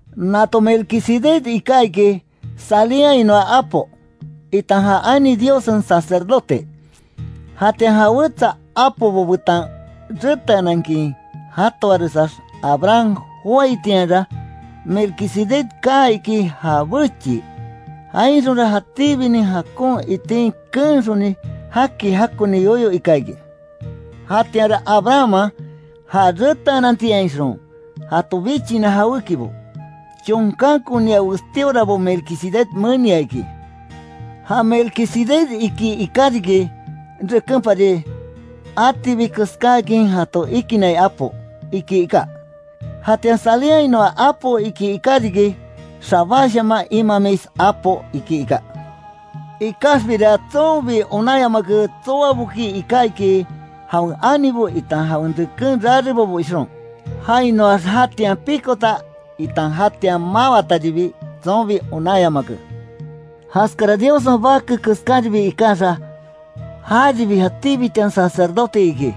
Nato Melquisedec iká iki, Salemhainoa apo, itan ja ani Diossen sacerdote. Jatian ja wetsa apobo betan reteanankin jatoaresax, Abraham joáitianra, Melquisedec kaa iki ja bechii, jainxonra jatíbinin jakon itin keenxoni, jaki jakoni yoyo ika iki. Jatianra Abrahamman, ja reteanantiainxon jato bichina jawékibo, chonkankonia westíorabo Melquisedec menia iki. Ja Melquisedec iki iká riki, rekenpari “atibi keskáakin jato ikinnai apo”, iki iká. Jatian Salemhainoa apo iki iká riki “xabashaman imamis apo”, iki iká. Ikaxbira tsonbi onanyamake tsoaboki iká iki, jawen anibo itan jawen reken rarebobo ixon, jainoax, jatian pikota itan jatian mawataribi, tsonbi onanyamake. Jaskara Diossen Bake keskaribi ikaxa, járibi jatíbitian sacerdote iki.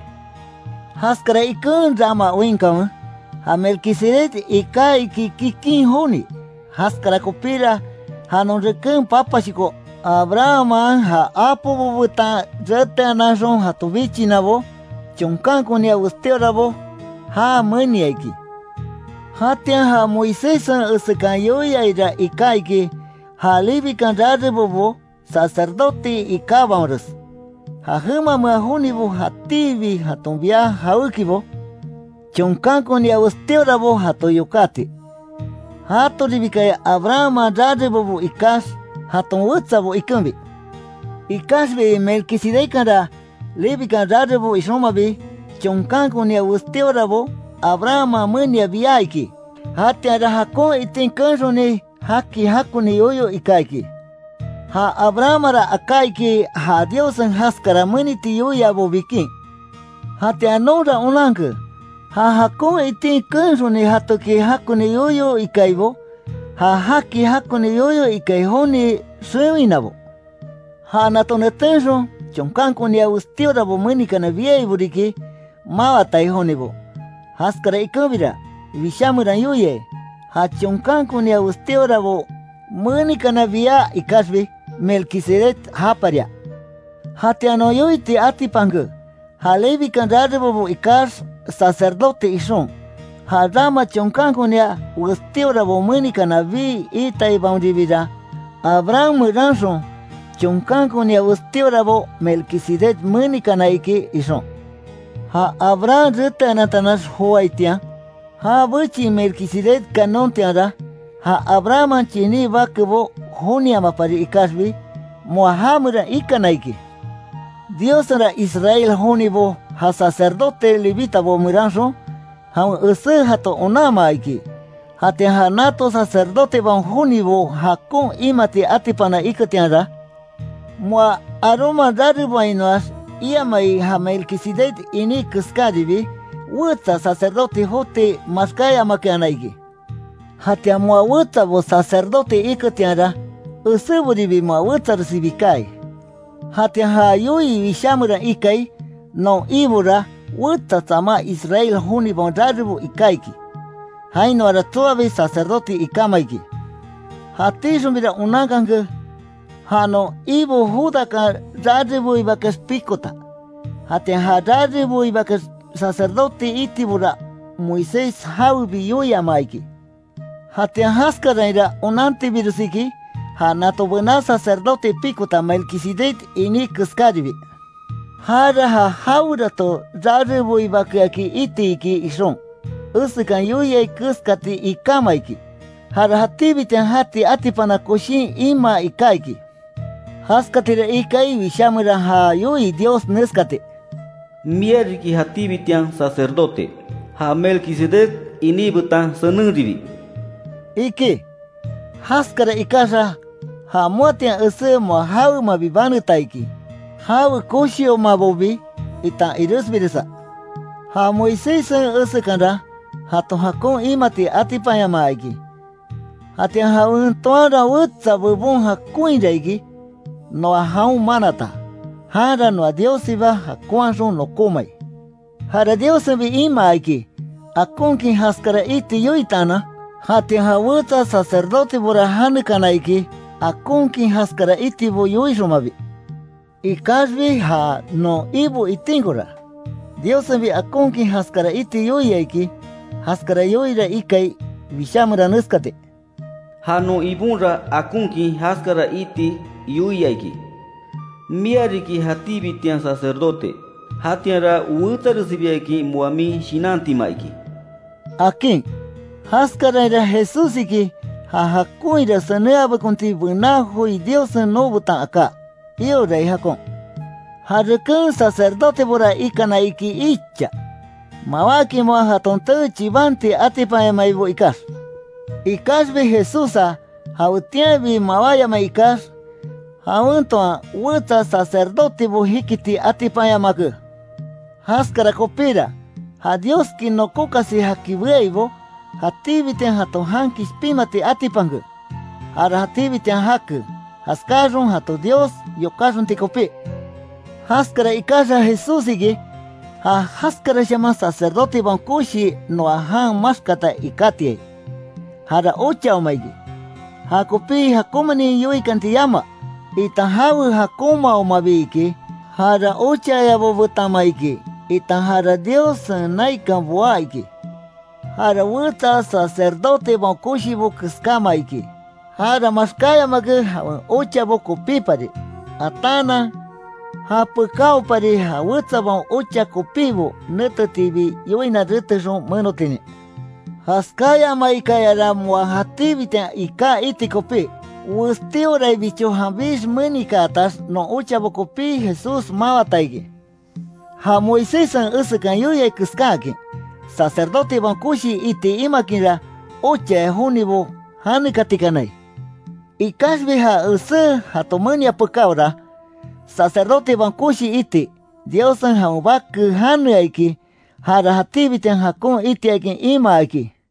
Jaskara iken rama oinkanwe, ja Melquisedec iká iki kikin joni, jaskara kopíra, ja non reken papashoko Abrahamman ja apobo betan reteananxon jato bichinabo, chonkankonia westíorabo já menia iki. Jatian ja Moiséssen esekan yoiaira iká iki, ja Levikan rarebobo sacerdote ikábaonres, ja jemamea jonibo jatíbi jaton bia jawékibo, chonkankonia westíorabo jato yokati, jatoribikaya Abrahamman rarebobo ikax jaton wetsabo ikenbi. Ikaxbi Melquisedeckanra, Levikan rarebo ixonmabi, chonkankonia westíorabo Abrahamman menia bia iki, jatianra jakon itin keenxoni, jaki jakoni yoyo ika iki. Ja Abrahammanra aká iki ja Diossen jaskara meniti yoiabo bikin. Jatian nonra onanke, ja jakon itin keenxoni jatoki jakoni yoyo ikaibo, ja jaki jakoni yoyo ikai joni xewinabo. Ja nato netenxon, chonkankonia Westíorabo menikana biaibo riki, mawatai jonibo, jaskara ikenbira, Wishá meran yoiai, ja chonkankonia westíorabo menikana bia ikaxbi, Melquisedec japaria. Jatianra non yoiti atipanke, ja Levikan rarebobo ikax sacerdote ixon, ja rama chonkankonia westíorabo menikana bii iitaibaonribira, Abraham meranxon, chonkankonia westíorabo Melquisedec menikana iki ixon. Ja Abraham reteanantanax joaitian, ja bechii Melquisedec kanontianra, ja Abrahamman chiní bakebo joniamapari ikaxbi, moa ja meran ikana iki. Diossenra Israel jonibo ja sacerdote Levitabo meranxon, jawen esé jato onanmaa iki, jatian ja nato sacerdotebaon jonibo jakon imati atipana iketianra, moa Aarónman rareboainoax, iamai ja Melquisedec iní keskaribi, wetsa sacerdote joti maxkáyamakeana iki. Jatian moa wetsabo sacerdote iketianra, eséboribi moa wetsaresibi kaai. Jatian ja yoii Wishá meran ikai non Ibora, wetsa tsamá Israel jonibaon rarebo iká iki, jainoara tsoabi sacerdote ikáma iki. Jatíxonbira onankanke, ja non Ibo Judakan rareboibakeax pikota, jatian ja rareboibakeax sacerdote itibora, Moisés jawebi yoiamaa iki. Jatian jaskarainra onantibires iki, ja nato bená sacerdote pikota Melquisedec iní keskaribi. Jara ja jawerato rareboibakeaki iti iki ixon, esekan yoiai keskati ikáma iki. Jara jatíbitian jati atipana koshin imaa iká iki. Jaskatira ikai Wishá meran já yoii Dios neskati: “Mia riki jatíbitian sacerdote, ja Melquisedec iní betan senenribi”, iki. Jaskara ikaxa, ja moatian esé moa jawemabi, baneta iki, jawe koshiomabobi itan iresbiresa. Ja Moiséssen esekanra, jato jakon imati atipanyamaa iki. Jatian jawen toanra wetsa bebon jakonhira iki, noa jaon manata, janra noa Diossiba jakonhaxon nokómai. Jara Diossenbi imaa iki, akonkin jaskara iti yoitaanan. Jatian ja wetsa sacerdotebora janekaakana iki, akonkin jaskara itibo yoixonmabi. Ikaxbi ja non Ibo itinkora, Diossenbi akonkin jaskara iti yoia iki. Jaskara yoiira ikai Wishá meran neskati: “Ja non Ibonra akonkin jaskara iti yoia iki: Mia riki jatíbitian sacerdote, jatianra wetsaresibiakin moa min shinantima iki”, akin. Jaskarainra Jesús iki, ja jakonhira senenhabekonti bená joi Diossen nobetan aká, iorai jakon. Ja reken sacerdotebora ikana iki icha, mawákin moa jaton tee chibanti atipanyamaibo ikax. Ikaxbi Jesússa, jawetianbi mawáyamai ikax, jawen toan wetsa sacerdotebo jikiti atipanyamake. Jaskara kopíra, ja Dioski nokókasi jaki beaibo, jatíbitian jato jan kishpinmati atipanke, jara jatíbitian jake, jaskáaxon jato Dios yokáxonti kopí. Jaskara ikaxa Jesús iki, ja jaskarashaman Sacerdotebaon Koshi noa jan maxkata ikátiai. Jara ochaoma iki, jakopi jakonmanin yoikanti yama, itan jawen jakonmaomabi iki, jara ochayabo betanma iki, itan jara Diossen naikan boá iki. Jara wetsa sacerdotebaon koshibo keskáma iki; jara maxkáyamake, jawen ochabo kopípari, ataanan, japekaopari ja wetsabaon ocha kopibo netetiibi, yoina retexon menotinin. Jaskáyamaikayara moa jatíbitian iká iti kopí, westíoraibicho janbix menikaatax, non ochabo kopí Jesús mawata iki. Ja Moiséssen esekan yoiai keskáakin, sacerdotebaon koshi iti imakinra, ochaya jonibo janekatikanai. Ikaxbi ja esé jato menia pekáora, sacerdotebaon koshi iti, Diossen jawen Bake janea iki, jara jatíbitian jakon itiakin imaa iki.